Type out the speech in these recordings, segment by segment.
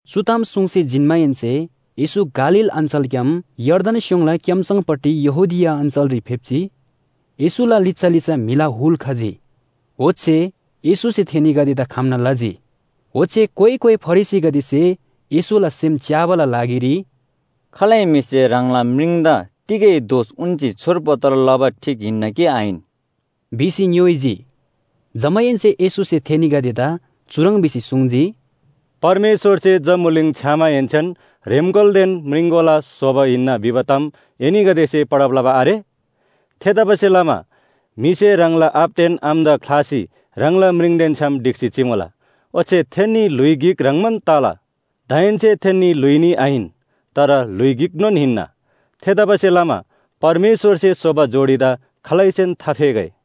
चु ताम सुङ्सी जिन्‍माहेन्‍से येशू गालील अञ्‍चलग्‍याम यर्दन स्‍योङला क्‍याम्‍सङपट्टि यहूदिया अञ्‍चलरी फेप्‍जी। येशूला लिच्‍छा लिच्‍छा म्‍हिला हुल खजी। ओच्‍छे येशूसे थेनीगदेदा खम्‍ना लजी। ओच्‍छे कोइ कोइ फरिसीगदेसे येशूला सेम च्‍याबाला लागिरी, “खालै म्‍हिसे ह्राङला म्रिङदा तिगै दोष उन्‍सी छोडपत्र लबा ठीक हिन्‍ना कि आहिन” भिसी ङ्‌योइजी। जमाहेन्‍से येशूसे थेनीगदेदा चुह्रङ् भिसी सुङ्जी, “परमेश्‍वरसे जम्‍बुलिङ छ्‌यामाहेन्‍सेन ‘ह्रेम्‍कोलादेन म्रिङकोला स्‍होबा हिन्‍ना’ भिबा ताम एनीगदेसे पढब लबा आरे? ‘थेतबासेलमा म्‍हिसे ह्राङला आबादेन आमादा ख्‍लासी ह्राङला म्रिङदेन छ्‌याम ढिक्‍सी चिमुला। ओच्‍छे थेन्‍नी ल्‍हुइ गिक ह्रङ्‌बान तला’ दाहेन्‍से थेन्‍नी ल्‍हुइ न्‍ही आहिन, तर ल्‍हुइ गिकनोन हिन्‍ना। थेतबासेलमा परमेश्‍वरसे स्‍होबा जोडीदा खालैसेन थाफेगै।”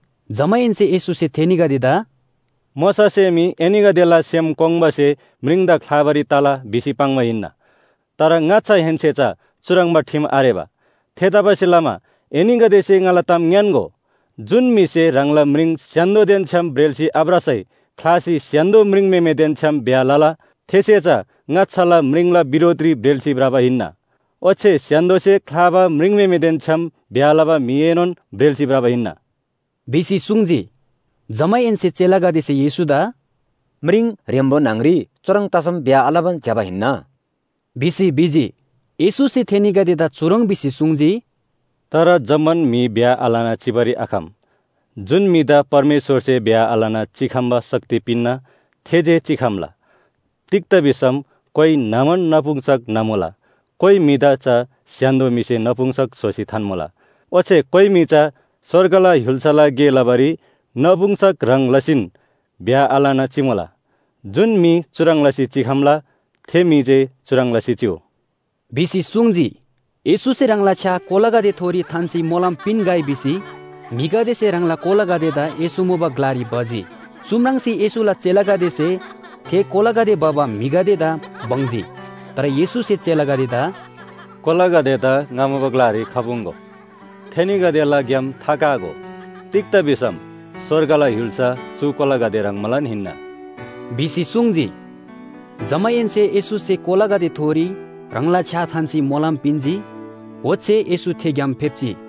जमाहेन्‍से येशूसे थेनीगदेदा “मोशासे मी एनीगदेला सेम कोङ्बासे म्रिङदा ख्‍लाबारी तला भिसी पाङ्बा हिन्‍ना। तर ङाच्‍छाहेन्‍से चा चुह्रङ्बा ठिम आरेबा। थेतबासेलमा एनीगदेसे ङाला ताम ङ्‌यान्‍गो, जुन म्‍हिसे ह्राङला म्रिङ स्‍य्‍हान्‍दोदेन छ्‌याम ब्रेल्‍सी आभ्रसै ख्‍लासी स्‍य्‍हान्‍दो म्रिङम्‍हेमेदेन छ्‌याम ब्‍याह लला थेसे चा ङाच्‍छाला म्रिङला बिरोधरी ब्रेल्‍सी भ्रबा हिन्‍ना। ओच्‍छे स्‍य्‍हान्‍दोसे ख्‍लाबा म्रिङम्‍हेमेदेन छ्‌याम ब्‍याह लबा म्‍हिएनोन ब्रेल्‍सी भ्रबा हिन्‍ना” भिसी सुङ्जी। जमाहेन्‍से चेलागदेसे येशूदा “म्रिङ ह्रेम्‍बो न्‍हङ‍री चुह्रङ् तसम ब्‍याह आलबान ज्‍यबा हिन्‍ना” भिसी भिजी। येशूसे थेनीगदेदा चुह्रङ् भिसी सुङ्जी, “तर जम्‍मान म्‍हि ब्‍याह आलना चिबारी आखम। जुन म्‍हिदा परमेश्‍वरसे ब्‍याह आलना चिखम्‍बा शक्ति पिन्‍ना थे जे चिखम्‍ला। तिग्‍दा भिसम कोइ न्‍हमान नपुंसक न्‍हमुला, कोइ म्‍हिदा चा स्‍य्‍हान्‍दो म्‍हिसे नपुंसक स्‍होसी थान्‍मुला। ओच्‍छे कोइ म्‍हि चा स्‍वर्गला य्‍हुल्‍साला गे लबारी नपुंसक ह्रङ् लसीन ब्‍याह आलना चिमुला। जुन म्‍हि चुह्रङ् लसी चिखम्‍ला, थे म्‍हि जे चुह्रङ् लसी चिउ” भिसी सुङ्जी। येशूसे ह्राङला छ्‌या कोलागदेथोरी थान्‍सी मोलम पिन्‍गै भिसी म्‍हिगदेसे ह्राङला कोलागदेदा येशू मुबा ग्‍लारी भजी। चु म्राङ्सी येशूला चेलागदेसे थे कोलागदे भबा म्‍हिगदेदा बङ्जी। तर येशूसे चेलागदेदा “कोलागदेदा ङा मुबा ग्‍लारी खपुङ्‍गो, थेनीगदेला ग्‍याम थाकागो। तिग्‍दा भिसम स्‍वर्गला य्‍हुल्‍सा चु कोलागदे ह्रङ्बालान हिन्‍ना” भिसी सुङ्जी। जमाहेन्‍से येशूसे कोलागदेथोरी ह्राङला छ्‌या थान्‍सी मोलम पिन्‍जी। ओच्‍छे येशू थे ग्‍याम फेप्‍जी।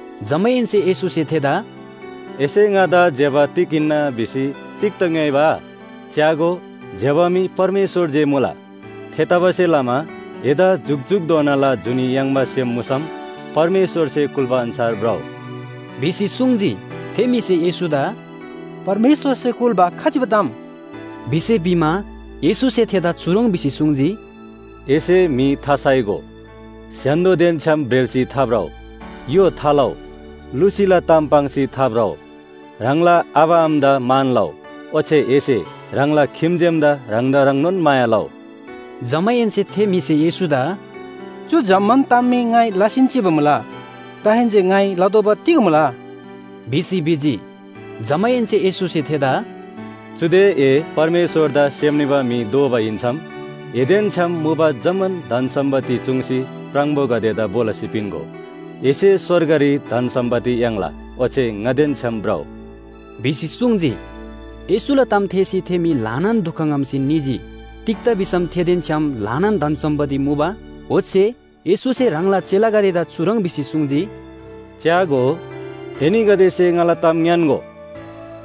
जमाहेन्‍से येशूसे थेदा “एसे ङादा ज्‍यबा तिग हिन्‍ना भिसी तिग्‍दा ङ्‌योइबा? च्‍यागो, ज्‍यबा मी परमेश्‍वर जे मुला। थेतबासेलमा एदा जुकजुकधोनाला जुनी याङ्बा सेम मुसम परमेश्‍वरसे कुल्‍बा अन्‍छार भ्रउ” भिसी सुङ्जी। थे म्‍हिसे येशूदा “परमेश्‍वरसे कुल्‍बा खजिबा ताम?” भिसी भिमा, येशूसे थेदा चुह्रङ् भिसी सुङ्जी, “एसे म्‍हि थासाइगो, स्‍य्‍हान्‍दोदेन छ्‌याम ब्रेल्‍सी थाभ्रउ, य्‍हो थालउ, लुसीला ताम पाङ्सी थाभ्रउ, ह्राङला आबा आमादा मान लउ, ओच्‍छे एसे ह्राङला खिम्‍जेमदा ह्राङदा ह्रङ्नोन माया लउ।” जमाहेन्‍से थे म्‍हिसे येशूदा “चु जम्‍मान ताम मी ङाइ लसीन चिबा मुला। दाहेन्‍से ङाइ लतोःबा तिग मुला?” भिसी भिजी। जमाहेन्‍से येशूसे थेदा “चुदे ए परमेश्‍वरदा सेम निबा म्‍हि दोबा हिन्‍सम एदेन छ्‌याम मुबा जम्‍मान धन सम्‍पत्ति चूङ्सी प्राङबोगदेदा भो लसी पिन्‍गो। एसे स्‍वर्गरी धन सम्‍पत्ति याङ्ला, ओच्‍छे ङादेन छ्‌याम भ्रउ।” भिसी सुङ्जी। येशूला ताम थेःसी थे म्‍हि ल्‍हानान दुख ङ्‍हम्‍सी निजी। तिग्‍दा भिसम थेदेन छ्‌याम ल्‍हानान धन सम्‍पत्ति मुबा। ओच्‍छे येशूसे ह्राङला चेलागदेदा चुह्रङ् भिसी सुङ्जी, “च्‍यागो, एनीगदेसे ङाला ताम ङ्‌यान्‍गो,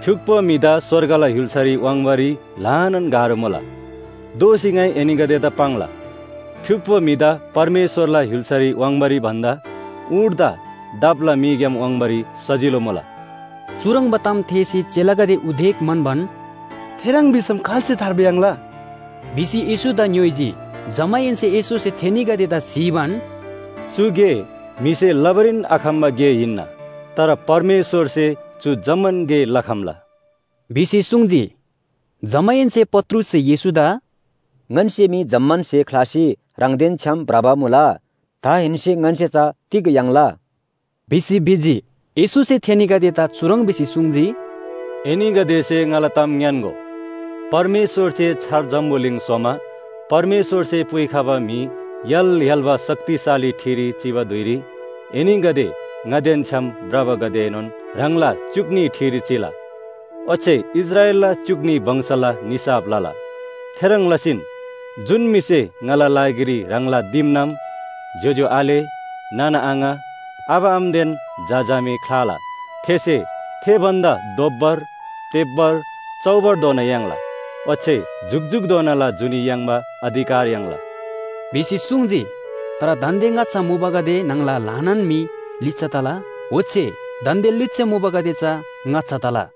फ्‍युक्‍पो म्‍हिदा स्‍वर्गला य्‍हुल्‍सारी वाङ्बारी ल्‍हानान गाह्रो मुला। दोःसी ङाइ एनीगदेदा पाङ्ला, फ्‍युक्‍पो म्‍हिदा परमेश्‍वरला य्‍हुल्‍सारी वाङ्बारी भन्‍दा ऊँटदा दापला मीग्‍याम वाङ्बारी सजिलो मुला।” चुह्रङ्बा ताम थेःसी चेलागदे उदेक म्‍हन्‍बान, “थेह्रङ् भिसम खाल्‍से थार्बा याङ्ला?” भिसी येशूदा ङ्‌योइजी। जमाहेन्‍से येशूसे थेनीगदेदा स्‍हीबान, “चु गे म्‍हिसे लबारीन आखम्‍बा गे हिन्‍ना। तर परमेश्‍वरसे चु जम्‍मान गे लखम्‍ला” भिसी सुङ्जी। जमाहेन्‍से पत्रुससे येशूदा “ङन्‍से मी जम्‍मान स्‍हे ख्‍लासी ह्राङदेन छ्‌याम भ्रबा मुला। दाहेन्‍से ङन्‍से चा तिग याङ्ला?” भिसी भिजी। येशूसे थेनीगदेदा चुह्रङ् भिसी सुङ्जी, “एनीगदेसे ङाला ताम ङ्‌यान्‍गो, परमेश्‍वरसे छार जम्‍बुलिङ स्‍होमा परमेश्‍वरसे पुइखबा म्‍हि य्‍हाल य्‍हाल्‍बा शक्तिशाली ठिरी चिबा धुइरी एनीगदे ङादेन छ्‌याम भ्रबागदेएनोन ह्राङला च्‍युक न्‍ही ठिरी चिला। ओच्‍छे इस्राएलला च्‍युक न्‍ही वंशला निसाफ लला। थेह्रङ् लसीन जुन म्‍हिसे ङाला लागिरी ह्राङला दिमनाम, ज्‍योज्‍यो आले, नाना आङा, आबा आमादेन झा झामे ख्‍लाला, थेसे थे भन्‍दा दोब्‍बर, तेब्‍बर, चौबरधोना याङ्ला। ओच्‍छे जुकजुकधोनाला जुनी याङ्बा अधिकार याङ्ला” भिसी सुङ्जी। तर दान्‍दे ङाच्‍छा मुबागदे न्‍हङला ल्‍हानान म्‍हि लिच्‍छा तला। ओच्‍छे दान्‍दे लिच्‍छा मुबागदे चा ङाच्‍छा तला।